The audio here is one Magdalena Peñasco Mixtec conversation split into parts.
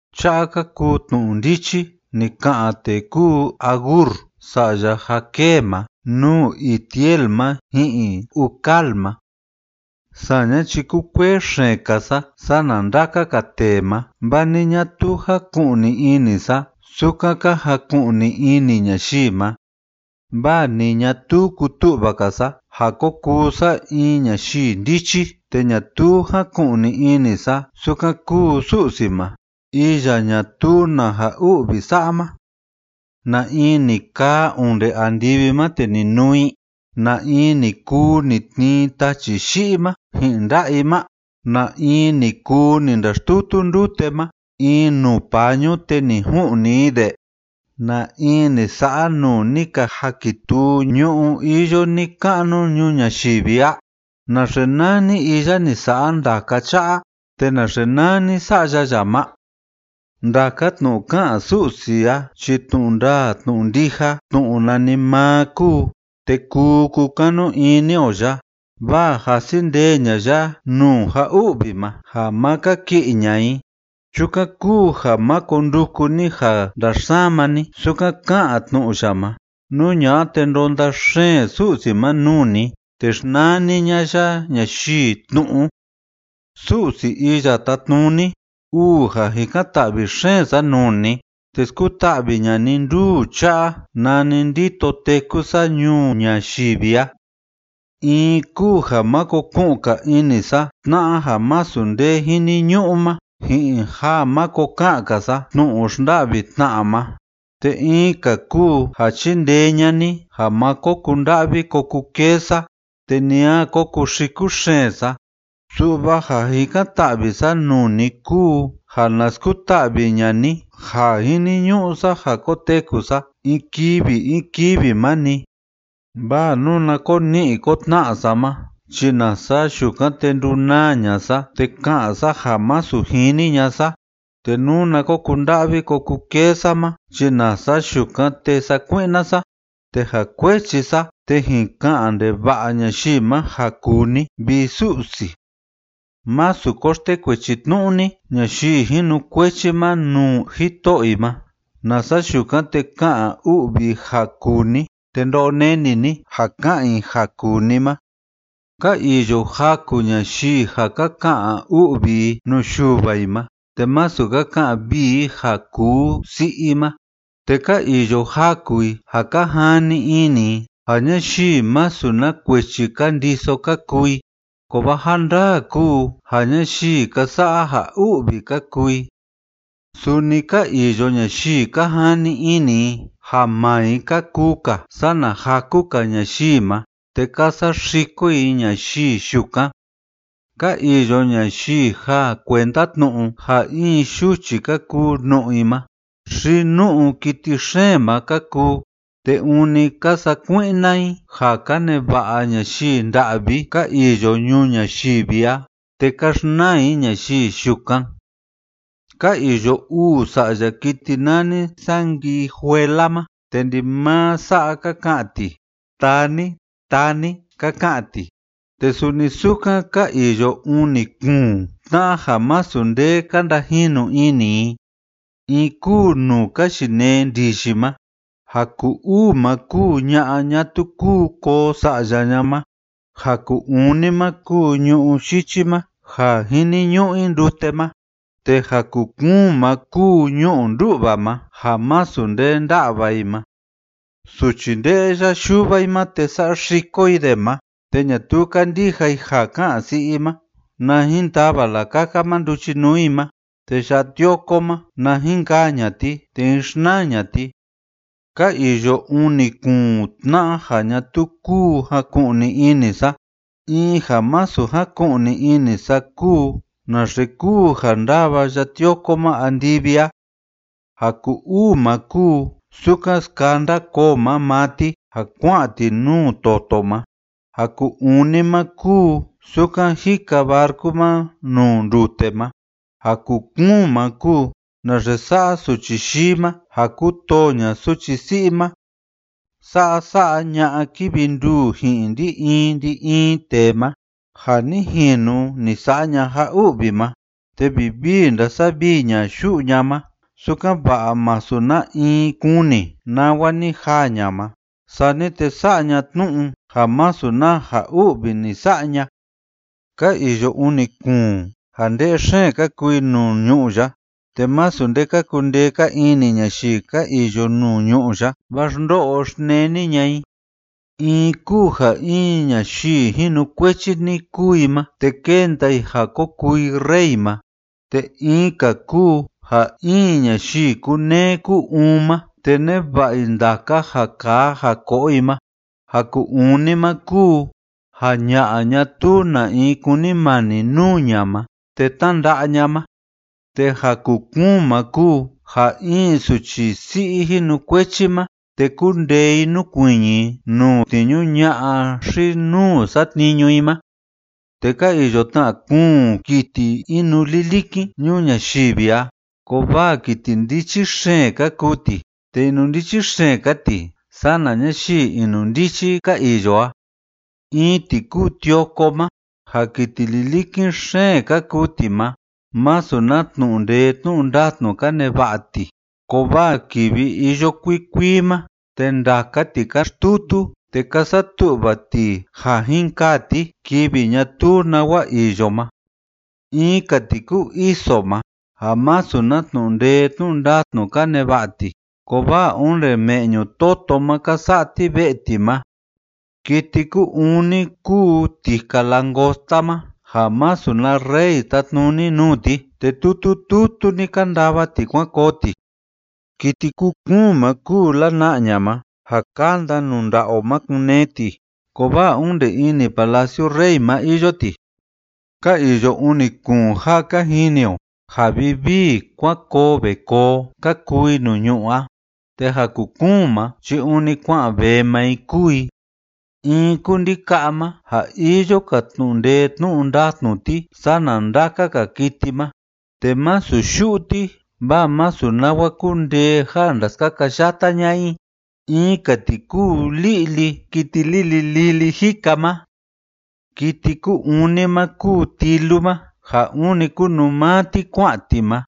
Cha'a ka kuu tnu'u ndichi ni ka'an tee kúu Agur sa'ya Jaqué ma nuu Itiel ma ji'in Ucal ma. Saña chi kúkuee xeen‑ka sa sana ndaka‑ka tee ma, vaa ni ñatuu jaku'ni ini sa sukan ka jaku'ni ini ñayii ma, vaa ni ñatuu kutu'va‑ka sa ja ko kuu sa in ñayii ndichi, te ñatuu jáku'ni ini sa sukan kúu Su'si ma, iya ñatuu na ja u'vi sa'a ma. ¿Na in ni kaa onde andivi ma te ni nuu i? ¿Na in ni kuu ni tnii tachi yi'i ma ji'in nda'a i ma? ¿Na in ni kuu ni ndaxtutu ndute ma in nuu pañu te ni ju'ni i de? ¿Na in ni sa'a nuu ni ka jakituu ñu'ú iyo ni‑ka'nu ñuu ñayivi a? ¿Naxe nani iya ni sa'a ndaka cha'a, te naxe nani sa'ya ya ma? Ndaka tnu'u ká'an Su'si a chi tnu'u ndaa tnu'u ndija, tnu'u nanimaa kúu, te kuu kukanu ini o ya, vaa jasi ndee ña'a ya nuu ja u'vi ma ja ma kaki'i ña'a i. Chukan kúu ja máko nduku ni ja ndaxsama ni sukan ká'an tnu'u ya ma, nú ña'a te ndonda xeen Su'si ma nuu ni te xnani ña'a ya ñayii tnu'u. Su'si Iya Tátnuni, uu ja jikan‑ta'vi xeen sa nuu ni, te skuta'vi ña'a ni nduu cha'a nani ndito téku sa ñuu ñayivi a. In kúu ja máko ku'un‑ka ini sa tna'a ja masu nde jiniñu'u ma, ji'in ja máko ka'an‑ka sa tnu'u xnda'vi tna'a ma. Te in‑ka kúu ja chindee ña'a ni ja má ko kunda'vi ko kukee sa te ni a ko kuxiku xeen sa. Su'va ja jikan‑ta'vi sa nuu ni kúu ja na skuta'vi ña'a ni ja jiniñu'u sa ja koteku sa in kivi in kivi ma‑ni. Vaa nuna ko ni'i ko tna'a sa ma chi nasa yukan, te ndunaa ña'a sa te ka'an sa ja masu jini ña'a sa, te nuna ko kunda'vi ko kukee sa ma chi nasa yukan, te sakui'na sa, te ja kuechi sa te jin ka'an ndeva'a ñayii ma ja kuu ni, vi Su'si. Másu ko xtekuechi tnu'u ni ñayii jinukuechi ma nuu jito'o i ma, nasa yukan te ka'an u'vi i ja kuu ni te ndo'o neni ni ja ka'an i ja kuu ni ma. Ka iyo jaku ñayii ja ka ka'an u'vi i nuu yuva i ma te masu ka ka'an vii i ja kuu si'i i ma, te ka iyo jaku i ja ka jani ini i ja ñayii masu na kuechi ka ndiso ka kuu i, kovaa ja ndandaa kúu ja ñayii ka sa'a ja u'vi ka kuu i. Suni ka iyo ñayii ka jani ini i ja maa i ka kuu‑ka sana jaku‑ka ñayii ma, te ka saxiko i ñayii yukan. Ka iyo ñayii ja kuenda tnu'u ja in yuchi ka kuu nu'u i ma, xi nu'u kiti xeen ma ka kuu, te ûni ka sakui'na i ja ka neva'a ñayii nda'vi ka iyo ñuu ñayivi a, te ka xnaa i ñayii yukan. Ka iyo uu sa'ya kiti nani sanguijuela ma, te ndimaa sa'a ka ka'an ti: “Taa ni, taa ni”, ka ka'an ti. Te suni sukan ka iyo uni kuun tna'a ja masu nde ka ndajinu ini i: In kúu nuu ka yinee ndiyi ma, ja ku‑uu ma kúu ña'a ñatuu kúu koo sa'ya ña ma, ja ku‑uni ma kúu ñu'ú yichi ma ja jiniñu'u i ndute ma, te ja ku‑kuun ma kúu ñu'u ndú'va ma ja masu nde ndá'va i ma. Suchi nde'ya yuva i ma te saxiko i de ma, te ñatuu kandija i ja ká'an si'i i ma, na jin tava lakaka ma nduchinuu i ma, te ya'a tioko ma, na jin kaa ña'a ti, te jín xnaa ña'a ti. Ka iyo uni kuun tna'a ja ñatuu kúu jaku'ni ini sa: In ja masu jaku'ni ini sa kúu naxe kúu ja ndava ya'a tioko ma andivi a, ja ku‑uu ma kúu sukan skanda koo ma maa ti ja kua'an ti nuu toto ma, ja ku‑uni ma kúu sukan jika barcu ma nuu ndute ma, ja ku‑kuun ma kúu naxe sa'a suchi yii ma, ja kútoo ña'a suchi si'i ma. Sa'a sa'a ña'a kívi nduu ji'in ndi‑in ndi‑in tee ma: Ja ni jinu ni sa'a ña ja u'vi ma, te vivii ndásavii ña yu'u ña ma, sukan‑va'a masu na in kuni nawa ni jaa ña ma, sani te sa'a ña tnu'u ja masu na ja u'vi ni sa'a ña. Ka iyo uni kuun ja nde'e xeen ka kuu i nuu ñu'ú ya te masu nde ka kundee‑ka ini ñayii ka iyo nuu ñu'ú ya, vaa xndo'o xneni ña'a i: In kúu ja in ñayii jinukuechi‑ni kúu i ma, te kénda i ja ko kuu i rey ma. Te in‑ka kúu ja in ñayii kúneé kú‑uun ma, te neva'a i ndaka ja kaa ja ko'o i ma. Ja ku‑uni ma kúu ja ña'a ñatuu na in kúnimani nuu ña ma, te tnánda'a ña ma. Te ja ku‑kuun ma kúu ja in suchi si'i jinukuechi ma te kúndee i núkuiñi i nuu tniñu ña'a xi‑nuu satniñu i ma. Te ka iyo tna kuun kiti inulilikin ñuu ñayivi a kovaa kiti ndichi xeen ka kuu ti, te inundichi xeen‑ka ti sana ñayii inundichi ka iyo a: In ti kúu tioko ma ja kiti lilikin xeen ka kuu ti ma, masu na tnu'u ndee tnu'u ndatnu ka neva'a ti, kovaa kivi iyo kuikuii ma, te ndaka ti ka xtutu te ka satu'va ti ja jin kaa ti kivi ñatuu nawa iyo ma. In‑ka ti kúu iso ma ja masu na tnu'u ndee tnu'u ndatnu ka neva'a ti, kovaa onde me'ñu toto ma ka sa'a ti ve'e ti ma. Kiti ku‑uni kúu tika langosta ma ja masu na rey tátnuni nuu ti, te tutu tutu‑ni ka ndava ti kuan koo ti. Kiti ku‑kuun ma kúu lana'ña ma ja kánda nuu nda'a o ma kun‑nee ti, kovaa onde ini palaciu rey ma iyo ti. Ka iyo uni kuun ja ka jini o ja vivii kuan koo ve koo ka kuu i nuu ñu'ú a, te ja ku‑kuun ma chi ûni kua'an vee maa i kúu i: In kúu ndika'a ma ja iyo‑ka tnu'u ndee tnu'u ndatnu ti sana ndaka‑ka kiti ma, te másu yu'u ti vaa masu nawa kundee ja ndaskakayata ña'a i. In‑ka ti kúu li'li kiti lili lili jika ma. Kiti ku‑uni ma kúu tilu ma ja ûni kunuu maa ti kua'an ti ma.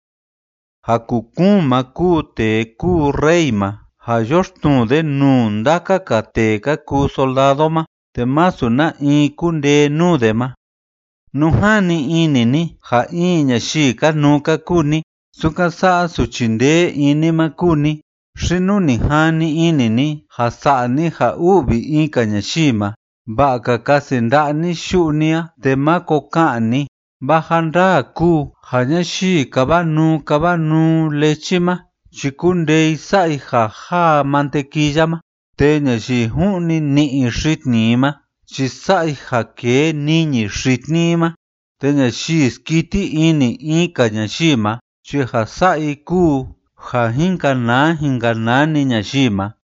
Ja ku‑kuun ma kúu tee kúu rey ma ja yoxtnuu de nuu ndaka‑ka tee ka kuu soldado ma, te másu na in kundee nuu de ma. Nú jani ini ni ja in ñayii kanuu‑ka kúu ni, sukan sa'a suchi ndee ini ma kúu ni, xi nú ni jani ini ni ja sa'a ni ja u'vi in‑ka ñayii ma, va'a‑ka kasi nda'a ni yu'u ni a te máko ka'an ni, vaa ja ndaa kúu ja ñayii káva nuu káva nuu lechi ma chi kúndee i sa'a i ja jáa mantequilla ma, te ñayii ju'ni ni'i xitni i ma chi sa'a i ja kee niñi xitni i ma, te ñayii skiti ini in‑ka ñayii ma chi ja sa'a i kúu ja jin kanaa jin kanaa‑ni ñayii ma.